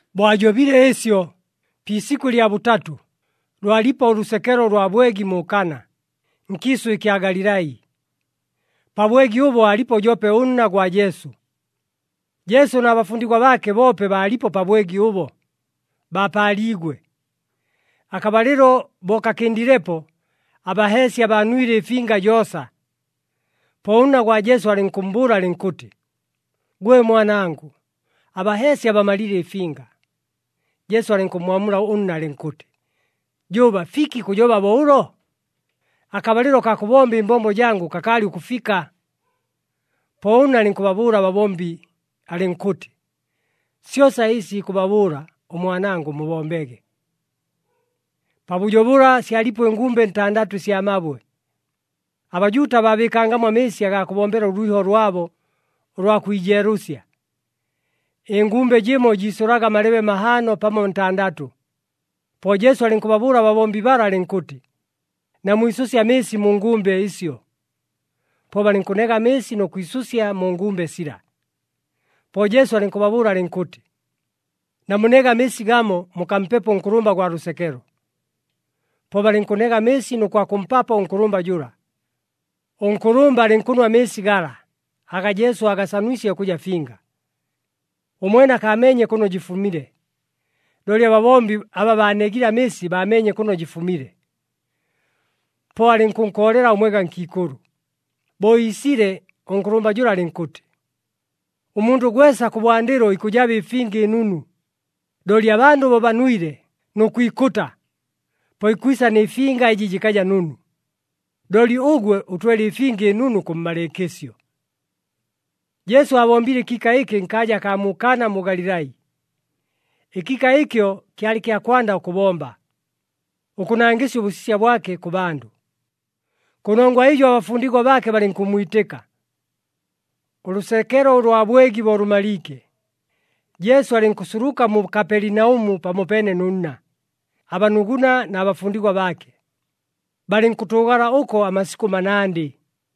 Bo ajobile ɨsyo, pi isikʉ lya bʉtatʉ, lwalipo ʉlʉsekelo ʉlwa bwegi mu Kana, nkiisʉ ɨkya Galilai. Pa bwegi ʉbo aalipo joope ʉnna gwa Jesu. Jesu na bafundigwa baake boope baalipo pa bwegi ʉbo, baapaaliigwe. Akabalɨlo bo kakɨndilepo, abaheesya baanwile ɨfinga joosa. Po ʉnna gwa Jesu alɨnkʉmmbʉʉla alɨnkʉtɨ, “Gwe mwanangʉ, abaheesya bamalile ɨfinga.” Jesu alɨnkʉmmwamula ʉnna alɨnkʉtɨ, “Jʉʉba, fiki kʉjoba bo ʉlo? Akabalɨlo kaa kʉbomba ɨmbombo jangʉ kakaalɨ ʉkʉfika.” Po ʉnna alɨnkʉbabʉʉla ababombi alɨnkʉtɨ, “Syosa ɨsi ikʉbabʉʉla ʉmwanangʉ, mubombege.” Pabʉjo bʉla, syalipo ɨngumbe ntandatʉ ɨsya mabwe. ABajuuta baabɨɨkangamo amɨɨsi agaa kʉbombela ʉlwiho lwabo, ʉlwa kwijeelʉsya. Ɨngumbe jɨmo jiisʉlaga amalebe mahaano pamo ntandatʉ. Po Jesu alɨnkʉbabʉʉla ababombi bala alɨnkʉtɨ, “Namwisʉsye amɨɨsi mu ngumbe ɨsyo.” Po balɨnkʉnega amɨɨsi nʉ kwisʉsya mu ngumbe sila. Po Jesu alɨnkʉbabʉʉla alɨnkʉtɨ, “Namunege amɨɨsi gamo, mukampepo ʉnkʉlʉmba gwa lʉsekelo.” Po balɨnkʉnega amɨɨsi nʉ kwakʉmpapo ʉnkʉlʉmba jʉla. Ʉnkʉlʉmba alɨnkʉnwa amɨɨsi gala, aga Jesu aagasanwisye ʉkʉja finga. Ʉmwene akaameenye kʉno jɨfumile, looli ababombi aba baanegile amɨɨsi baameenye kʉno jɨfumile. Po alɨnkʉnkoolela ʉmwega nkiikʉlʉ. Bo iisile, ʉnkʉlʉmba jʉla alɨnkʉtɨ, “Ʉmundʉ gwesa kʉbwandɨlo ikʉjaba ɨfinga ɨnunu, looli abandʉ bo banwile nʉ kwikʉta, po ikwisa nɨ finga ɨjɨ jɨkaja nunu. Looli ʉgwe ʉtwele ɨfinga ɨnunu kʉmmalɨɨkɨsyo!” Jesu aabombile ɨkiika ɨkɨ nkaaja akaa mu Kana mu Galilai. Ɨkiika ɨkyo kyalɨ kya kwanda ʉkʉbomba, ʉkʉnangɨsya ʉbʉsisya bwake kʉ bandʉ. Kʉnongwa ɨjo abafundigwa baake balɨnkʉmmwitɨka. Ʉlʉsekelo lwa bwegi bo lʉmaliike, Jesu alɨnkʉsuluka mu Kapelinaʉmu pamopeene nʉ nna, abanuguna na bafundigwa baake. Balɨnkʉtʉʉgala ʉko amasikʉ manandɨ.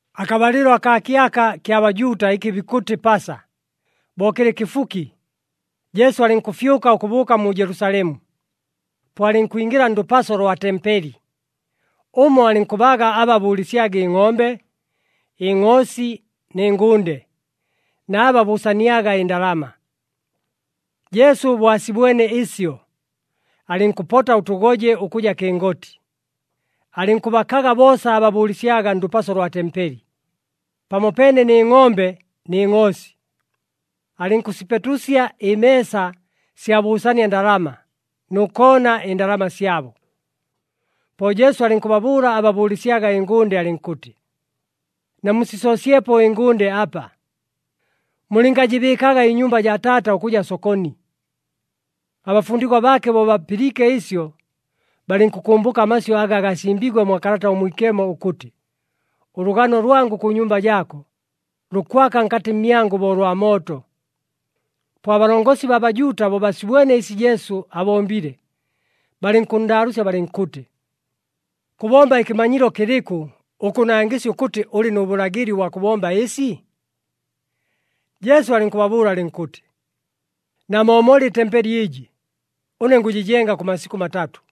Akabalɨlo akaa kyaka kya Bajuuta, ɨkɨ bikʉtɨ Pasa, bo kɨlɨ kɨfuki, Jesu alɨnkʉfyʉka ʉkʉbʉʉka mu Jelusalemu. Po alɨnkwingɨla ndʉpaso lwa tempeli. Ʉmo alɨnkʉbaaga aba bʉʉlɨsyaga ɨngʼombe, ɨngʼoosi nɨ ngʉnde, na aba bʉʉsaniaga ɨndalama. Jesu bo asibwene ɨsyo, alɨnkʉpota ʉtʉgoje ʉkʉja kɨngoti, alɨnkʉbakaga boosa aba bʉʉlɨsyaga ndʉpaso lwa tempeli, pamopeene nɨ ngʼombe nɨ ngʼoosi. Alɨnkʉsipetusya ɨmeesa sya bʉʉsania ndalama nʉ koona ɨndalama syabo. Po Jesu alɨnkʉbabʉʉla aba bʉʉlɨsyaga ɨngʉnde alɨnkʉtɨ, “Namusisoosyepo ɨngʉnde apa. Mulɨngajɨbɨɨkaga ɨnyumba jaa Taata ʉkʉja sokoni.” Abafundigwa baake bo bapɨliike ɨsyo, balɨnkʉkʉmbʉka amasyʉ aga gasimbiigwe mwa Kalata ʉMwikemo ʉkʉtɨ, “Ʉlʉgano lwangʉ kʉ nyumba jaako, lukwaka nkatɨ mmyangʉ bo ʉlwa mooto.” Po abalongosi baa Bajuuta bo basibwene ɨsi Jesu abombile, balɨnkʉnndaalʉʉsya balɨnkʉtɨ, “Kʉbomba ɨkɨmanyilo kɨlɨkʉ, ʉkʉnangɨsya ʉkʉtɨ ʉlɨ nʉ bʉlagɨli ʉbwa kʉbomba ɨsi?” Jesu alɨnkʉbabʉʉla alɨnkʉtɨ, “Namoomole ɨtempeli ɨjɨ, ʉne ngʉjɨjenga kʉ masikʉ matatʉ.”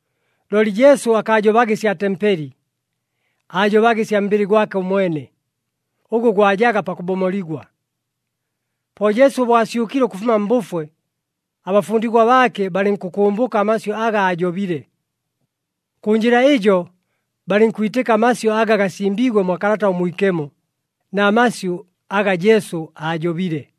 Looli Jesu akaajobaga ɨsya tempeli, aajobaga ɨsya mbɨlɨ gwake ʉmwene, ʉgʉ gwajaga pakʉbomoligwa. Po Jesu bo asyʉkile ʉkʉfuma mbʉfwe, abafundigwa baake balɨnkʉkʉmbʉka amasyʉ aga aajobile. Kʉ njɨla ɨjo, balɨnkwitɨka amasyʉ aga gasimbiigwe mwa Kalata ʉMwikemo, na masyʉ aga Jesu aajobile.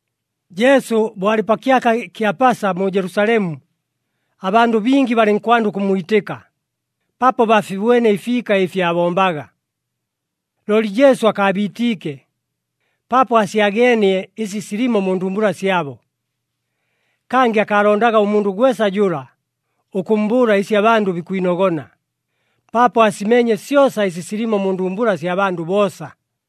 Jesu bo alɨ pa kyaka kya Pasa mu Jelusalemu, abandʉ bingi balɨnkwanda ʉkʉmmwitɨka, paapo baafibwene ɨfiika ɨfi aabombaga. Looli Jesu akaabiitiike, paapo aasyageenie ɨsi silimo mu ndumbula syabo. Kangɨ akaalondaga ʉmundʉ gwesa jʉla, ʉkʉmmbʉʉla ɨsi abandʉ bikwinogona, paapo aasimeenye syosa ɨsi silimo mu ndumbula sya bandʉ boosa.